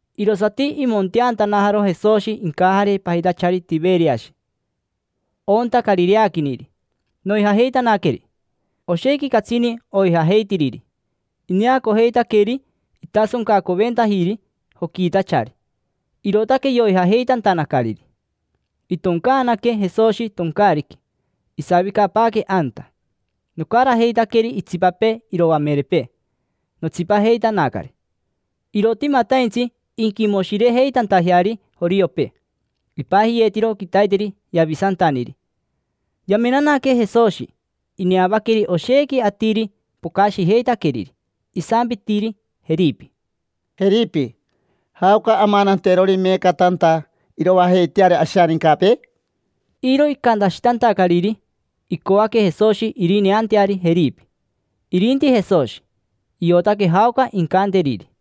Irosati imonteantanajaro Jesoshi incajare pajitachari Tiveriashi, onta carireaquiniri; noijajeitanaqueri. Oshequi catsini oijajeitiriri. Ineacojeitaqueri itasoncacoventajiri joquiitachari, irootaque yoijajeitantanacariri. Itoncaanaque Jesoshi toncaariqui. Isavicapaaque anta, nocarajeitaqueri itsipapee iroamerepee, notsipajeitanacari. Irotimataintsi inquimoshirejeitantajeari joriopee. Ipajiyeetiro quitaiteri “Yavisantaniri”. Yamenanaque Jesoshi. Ineavaqueri oshequi atiri pocashijeitaqueriri, isampitiri Jeripi: —Jeripi, ¿jaoca amananterori meeca tanta iroajeiteari ashanincapee? Iro icantashitantacariri, icoaque Jesoshi irineanteari Jeripi. Irinti Jesoshi, iotaque jaoca incanteriri.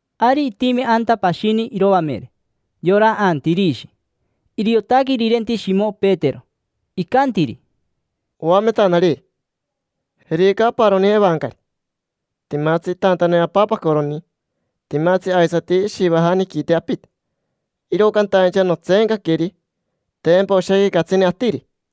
Ari itimi anta pashini iroamere, yora Antirishi. Iriotaque irirenti Shimo Petero. Icantiri: —Oametanari, jerica aparoni evancari, timatsi itantane apapacoroni. Timatsi aisati ishivajaniquite apite. Iro cantaincha notseencaqueri: tempa oshequi catsini atiri.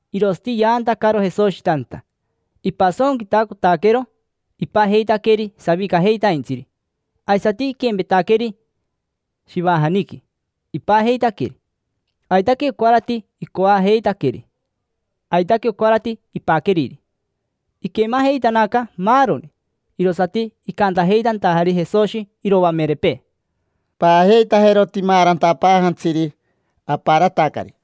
Irosati yaantacaro Jesoshi tanta. Ipasonquitacotaquero. Ipajeitaqueri savicajeitaintsiri. Aisati iquempetaqueri shivajaniqui, ipajeitaqueri. Aitaque ocarati icoajeitaqueri aitaque ocarati ipaqueriri. Iquemajeitanaca maaroni. Irosati icantajeitantajari Jesoshi iroamerepee: —Paajeitajero timaarantapaajantsiri, aparatacari.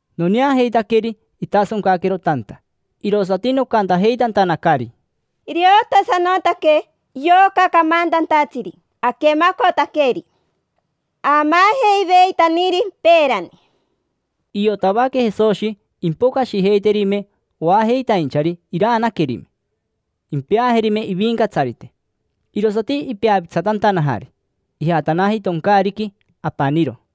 Noneajeitaqueri itasoncaquero tanta, irosati nocantajeitantanacari: —Iriotasanotaque yoca camantantatsiri aquemacotaqueri, aamaajeiveitaniri peerani. Iotavaque Jesoshi impocashijeiterime oajeitainchari iraanaquerime, impeajerime ivincatsarite. Irosati ipeapitsatantanajari. Ijatanaji toncaariqui apaniro.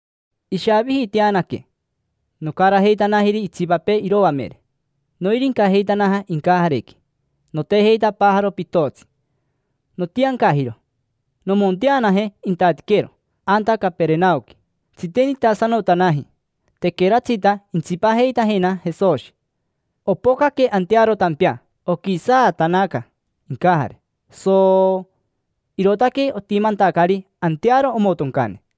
Ishavijiiteanaque, nocarajeitanajiri itsipapee iroamere, noirincajeitanaja incajarequi, notejeitapaajaro pitotsi. Notiancajiro nomonteanaje intatiquero, anta Caperenaoqui. Tsitenitasanotanaji, tequeratsita intsipajeitajena Jesoshi. Opocaque antearo tampea, oquisaatanaca incajare, soooo, irootaque otimantacari antearo omotoncane.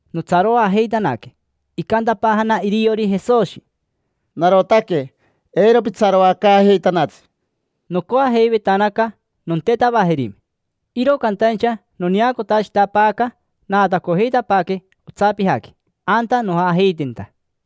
Notsaroajeitanaque. Icantapaajana iriori Jesoshi: —Narotaque, eiro pitsaroacaajeitanatsi. Nocoajeivetanaca nontetavajerime, iro cantaincha noneacotashitapaaca naatacojeitapaaque otsapijaqui, anta nojajeitenta.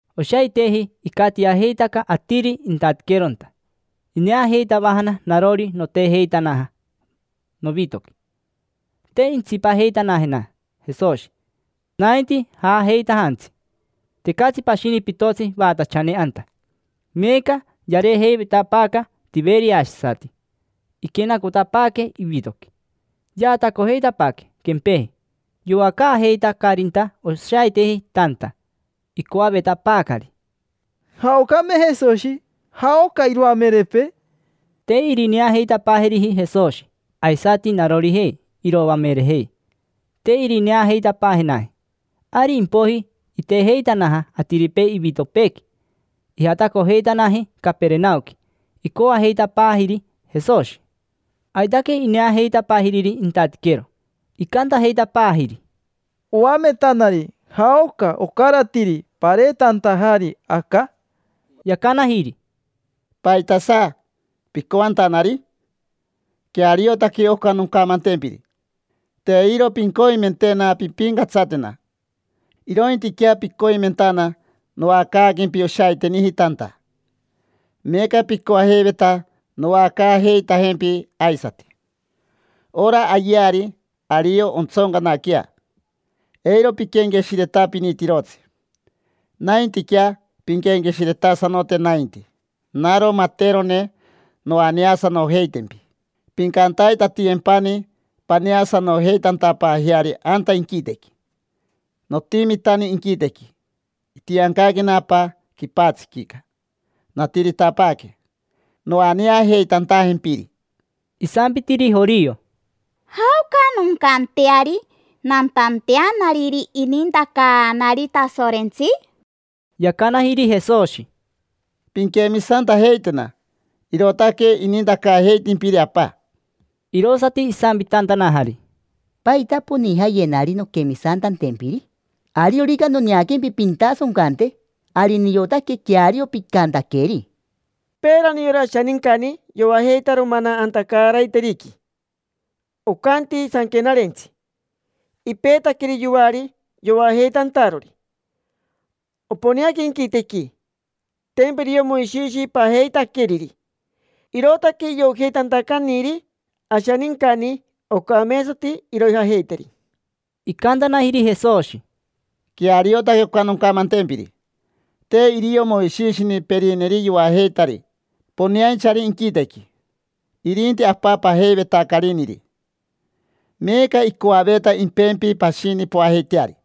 Oshaiteji icatiajeitaca atiri intatiqueronta. Ineajeitavajana narori notejeitanaja novitoqui. Te intsipajeitanajena Jesoshi, nainti jajeitajantsi. Tecatsi pashini pitotsi vaatachane anta. Meeca yareejeivetapaaca tiveriashisati, iquenacotapaaque ivitoqui. Yaatacojeitapaaque quempeji yoacaajeitacarinta oshaiteji tanta. Icoavetapaacari: —¿Jaocame Jesoshi? ¿Jaoca iroamerepee? Te irineajeitapaajeriji Jesoshi; aisati narorijei iroamerejei, te irineajeitapaajenaji. Ari impoiji itejeitanaja atiripee ivitopeequi, ijatacojeitanaji Caperenaoqui, icoajeitapaajiri Jesoshi. Aitaque ineajeitapaajiriri intatiquero. Icantajeitapaajiri: —Oametanari, ¿jaoca ocaratiri pareetantajari aca? Yacanajiri: —¿Paitasa picoantanari? Queariotaque oca noncamantempiri: te iro pincoimentena pimpincatsatena, irointiquea picoimentana noacaaquempi oshaiteniji tanta. Meeca picoajeiveta noacaajeitajempi aisati. Ora ayeari ario ontsoncanaquea. Eiro piquenqueshiretapinitirotsi. Naintiquea pinquenqueshiretasanote nainti, naro materone noaneasanojeitempi pincantaitatiyempani paneasanojeitantapaajeari anta inquitequi. Notimitani inquitequi, itiancaquena Apa quipatsiquica, natiritapaaque noaneajeitantajempiri. Isampitiri jorio: —¿Jaoca noncanteari nantanteanariri inintacaanari Tasorentsi? Yacanajiri Jesoshi: —Pinquemisantajeitena: irootaque inintacaajeitimpiri Apa. Irosati isampitantanajari: —¿Paita ponijayenari nonquemisantantempiri? Ariorica noneaquempi pintasoncante, ari niotaque queario picantaqueri. Peerani yora ashanincani yoajeitaro mana anta caaraiteriqui. Ocanti sanquenarentsi: “Ipeetaqueri yoari yoajeitantarori. Oponeaca inquitequi”. Tempa irio Moishishi pajeitaqueriri, irootaque iojeitantacaniri ashanincani ocameetsati iroijajeiteri. Icantanajiri Jesoshi: —Queariotaque oca noncamantempiri. Te irio Moishishini perineri yoajeitari poneainchari inquitequi. Irinti Apa pajeivetacariniri. Meeca icoaveta impempi pashini poajeiteari,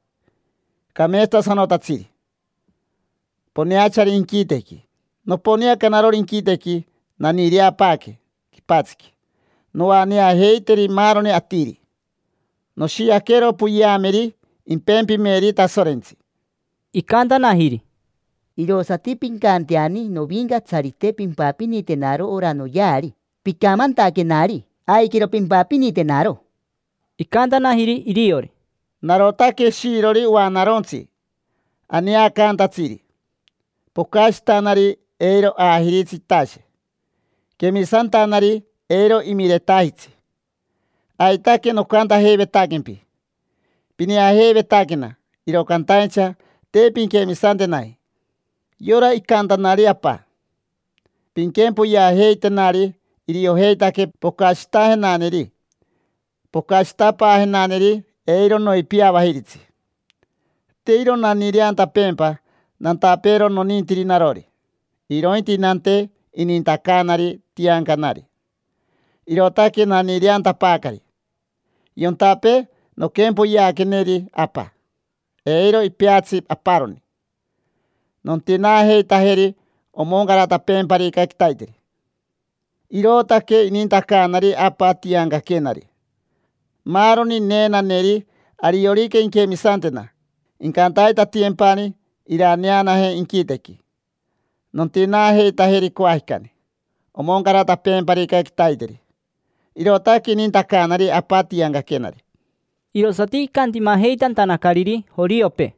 cameetsatasanotatsiri, poneachari inquitequi. Noponeaca narori inquitequi, naniireapaaque quipatsiqui noaneajeiteri maaroni atiri: noshiaquero poyeameri impempimeri Tasorentsi. Icantanajiri: —Irosati pincanteani, novincatsarite, pimpapinitenaro ora noyeari picamantaquenari. Aiquero pimpapinitenaro. Icantanajiri iriori: —Narotaque shiirori oanarontsi aneacantatsiri. Pocashitanari eiro aajiritsi itashe. Quemisantanari eiro imiretajitsi. Aitaque nocantajeivetaquempi. Pineajeivetaquena, iro cantaincha te pinquemisantenaji. Yora icantanari Apa: “Pinquempoyeajeitenari”, iriojeitaque pocashitajenaneri. Pocashitapaajenaneri eiro noipiavajiritsi. Te iro naniireantapeempa nantapeero nonintiri narori, irointi nante inintacaanari tiancanari. Irootaque naniireantapaacari. Yontapee noquempoyeaqueneri Apa, eiro ipeatsi aparoni. Nontinaajeitajeri omoncaratapeemparica quitaiteri. Irootaque inintacaanari Apa tiancaquenari. Maaroni neenaneri, ariorica inquemisantena, incantaitatiyempani iraneanaje inquitequi. Nontinaajeitajeri coajicani, omoncaratapeemparica quitaiteri. Irootaque inintacaanari Apa tiancaquenari. Irosati icantimajeitantanacariri joriopee.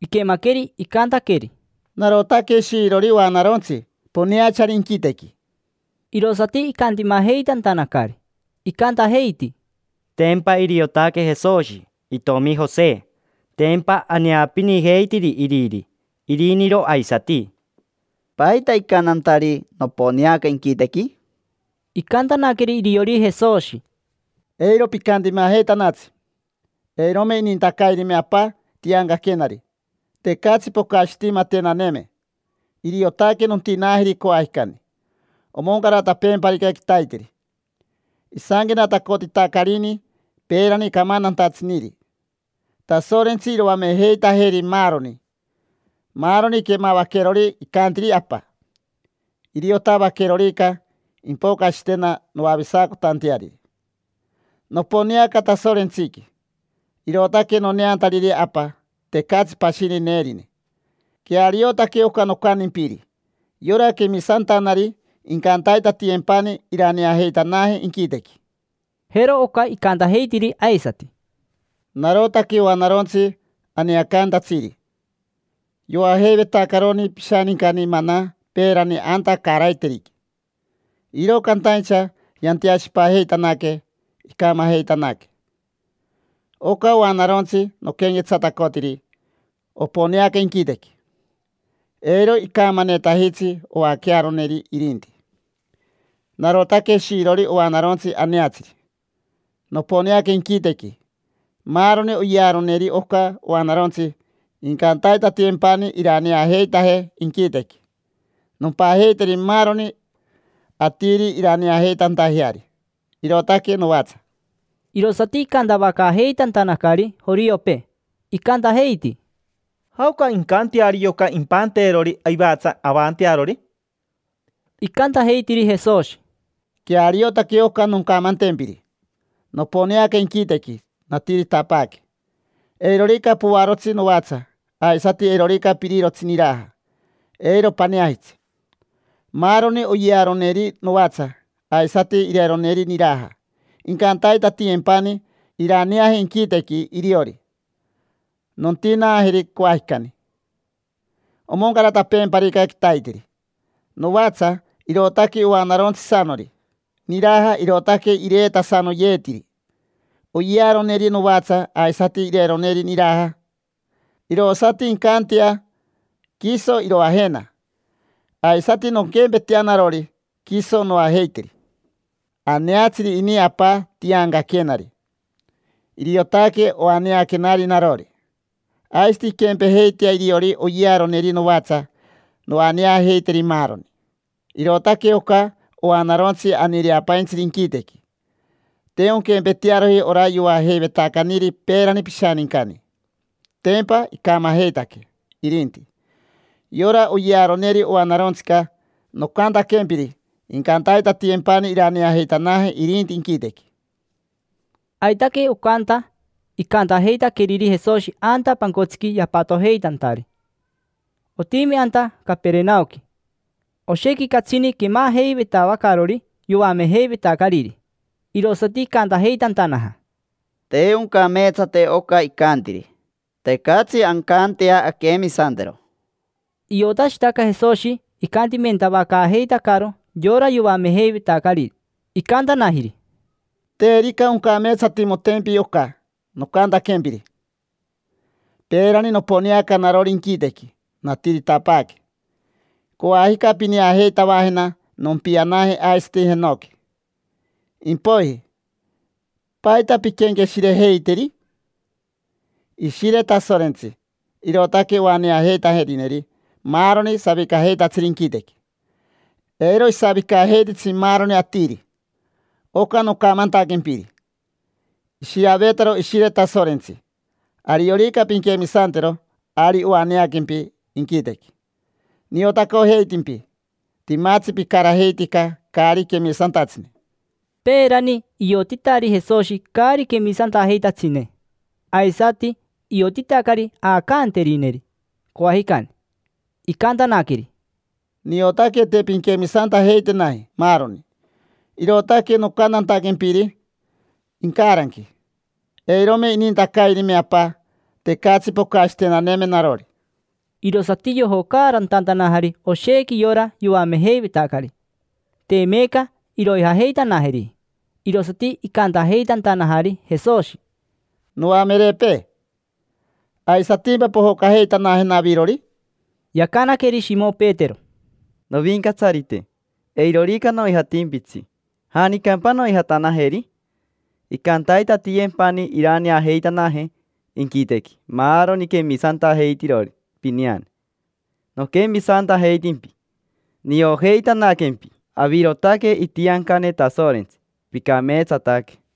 Iquemaqueri icantaqueri: “Narotaque shiirori oanarontsi, poneachari inquitequi”, irosati icantimajeitantanacari. Icantajeiti: —Tempa iriotaque Jesoshi, itomi Jose. Tempa aneapinijeitiri iriri, iriniro aisati. ¿Paita icantantari: “Noponeaca inquitequi”? Icantanaqueri iriori Jesoshi: —Eiro picantimajeitanatsi. Eirome inintacairime Apa tiancaquenari, tecatsi pocashitimatenaneme. Iriotaque nontinaajeri coajicani omoncaratapeemparica quitaiteri. Isanquenatacotitacarini peerani camantantatsiniri: “Tasorentsi iroamejeitajeri maaroni”. Maaroni quemavaquerori icantiri Apa, iriotavaquerorica, impocashitena noavisacotanteariri. Noponeanaca Tasorentsiqui, irootaque noneantariri Apa. Tecatsi pashini neerine. Queariotaque oca nocantimpiri. Yora quemisantanari incantaitatiyempani iraneajeitanaje inquitequi. Jero oca icantajeitiri aisati: —Narotaque oanarontsi aneacaantatsiri. Yoajeivetacaroni pishanincani mana peerani anta caaraiteriqui, iro cantaincha yanteashipajeitanaque, icamajeitanaque. Oca oanarontsi noquenquetsatacotiri oponeaca inquitequi. Eiro icamanetajitsi oaquearoneri irinti. Narotaque shiirori oanarontsi aneatsiri, noponeaca inquitequi. Maaroni oyearoneri oca oanarontsi incantaitatiyempani iraneajeitaje inquitequi. Nompajeiteri maaroni atiri iraneajeitantajeari: irootaque novatsa. Irosati icantavacaajeitantanacari joriopee. Icantajeiti: —¿Jaoca incanteari yoca impanteerori ivatsa avantearori? Icantajeitiri Jesoshi: —Queariotaque oca noncamantempiri. Noponeaca inquitequi, natiritapaaque. Eirorica poarotsi novatsa, aisati eirorica pirirotsi niraja, eiro paneajitsi. Maaroni oyearoneri novatsa, aisati ireroneri niraja, incantaitatiyempani iraneaje inquitequi iriori. Nontinaajeri coajicani omoncaratapeemparica quitaiteri. Novatsa irootaque oanarontsisanori. Niraja irootaque ireetasanoyeetiri. Oyearoneri novatsa aisati ireroneri niraja irosati incantea, quiso iroajena. Aisati nonquempetea narori, quiso noajeiteri. Aneatsiri ini Apa tiancaquenari: iriotaque oaneaquenari narori. Aisati inquempejeitea iriori oyearoneri novatsa, noaneajeiteri maaroni. Irootaque oca oanarontsi aniireapaintsiri inquitequi. Te onquempetearoji ora yoajeivetacaniri peerani pishanincani. Tempa icamajeitaque irinti. Yora oyearoneri oanarontsica nocantaquempiri incantaitatiyempani iraneajeitanaje irinti inquitequi. Aitaque ocanta icantajeitaqueriri Jesoshi anta pancotsiqui yapatojeitantari. Otimi anta Caperenaoqui. Oshequi catsini quemajeivetavacarori yoamejeivetacariri, irosati icantajeitantanaja: —Te oncameetsate oca icantiri, tecatsi ancantea anquemisantero. Iotashitaca Jesoshi icantimentavacaajeitacaro yora yoamejeivetacari. Icantanajiri: —Terica oncameetsatimotempi oca nocantaquempiri. Peerani noponeanaca narori inquitequi, natiritapaaque. Coajica pineajeitavajena nompianaje aisati jenoqui. Impoiji, ¿paita pinquenqueshirejeiteri? Ishire Tasorentsi, irootaque oaneajeitajerineri maaroni savicajeitatsiri inquitequi. Eiro isavicajeititsi maaroni atiri. Oca nocamantaquempiri oshiavetaro Ishire Tasorentsi: ariorica pinquemisantero, ari oaneaquempi inquitequi. Niotacojeitimpi: timatsi picarajeitica caari quemisantatsine. Peerani iotitari Jesoshi caari quemisantajeitatsine. Aisati iotitacari aacanterineri coajicani. Icantanaqueri: —Niotaque te pinquemisantajeitenaji maaroni, irootaque nocantantaquempiri incaranqui: “Eirome inintacairime Apa, tecatsi pocashitenaneme narori”. Irosati yojocaarantantanajari oshequi yora yoamejeivetacari. Te meeca iroijajeitanajeriji. Irosati icantajeitantajanari Jesoshi: —Noamerepee, ¿aisatimpa pojocajeitanajena avirori? Yacanaqueri Shimo Petero: —Novincatsarite, eirorica noijatimpitsi, ¿janicampa noijatanajeri? Incantaitatiyempani iraneajeitanaje inquitequi maaroni quemisantajeitirori pineane. Noquemisantajeitimpi, niojeitanaquempi; avirotaque itiancane Tasorentsi, picameetsataque.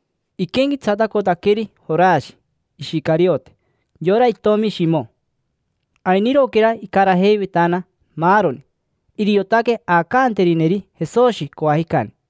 Iquenquetsatacotaqueri Jorashi Ishicariote, yora itomi Shimo. Ainiroquera icarajeivetana maaroni. Iriotaque aacanterineri Jesoshi coajicani.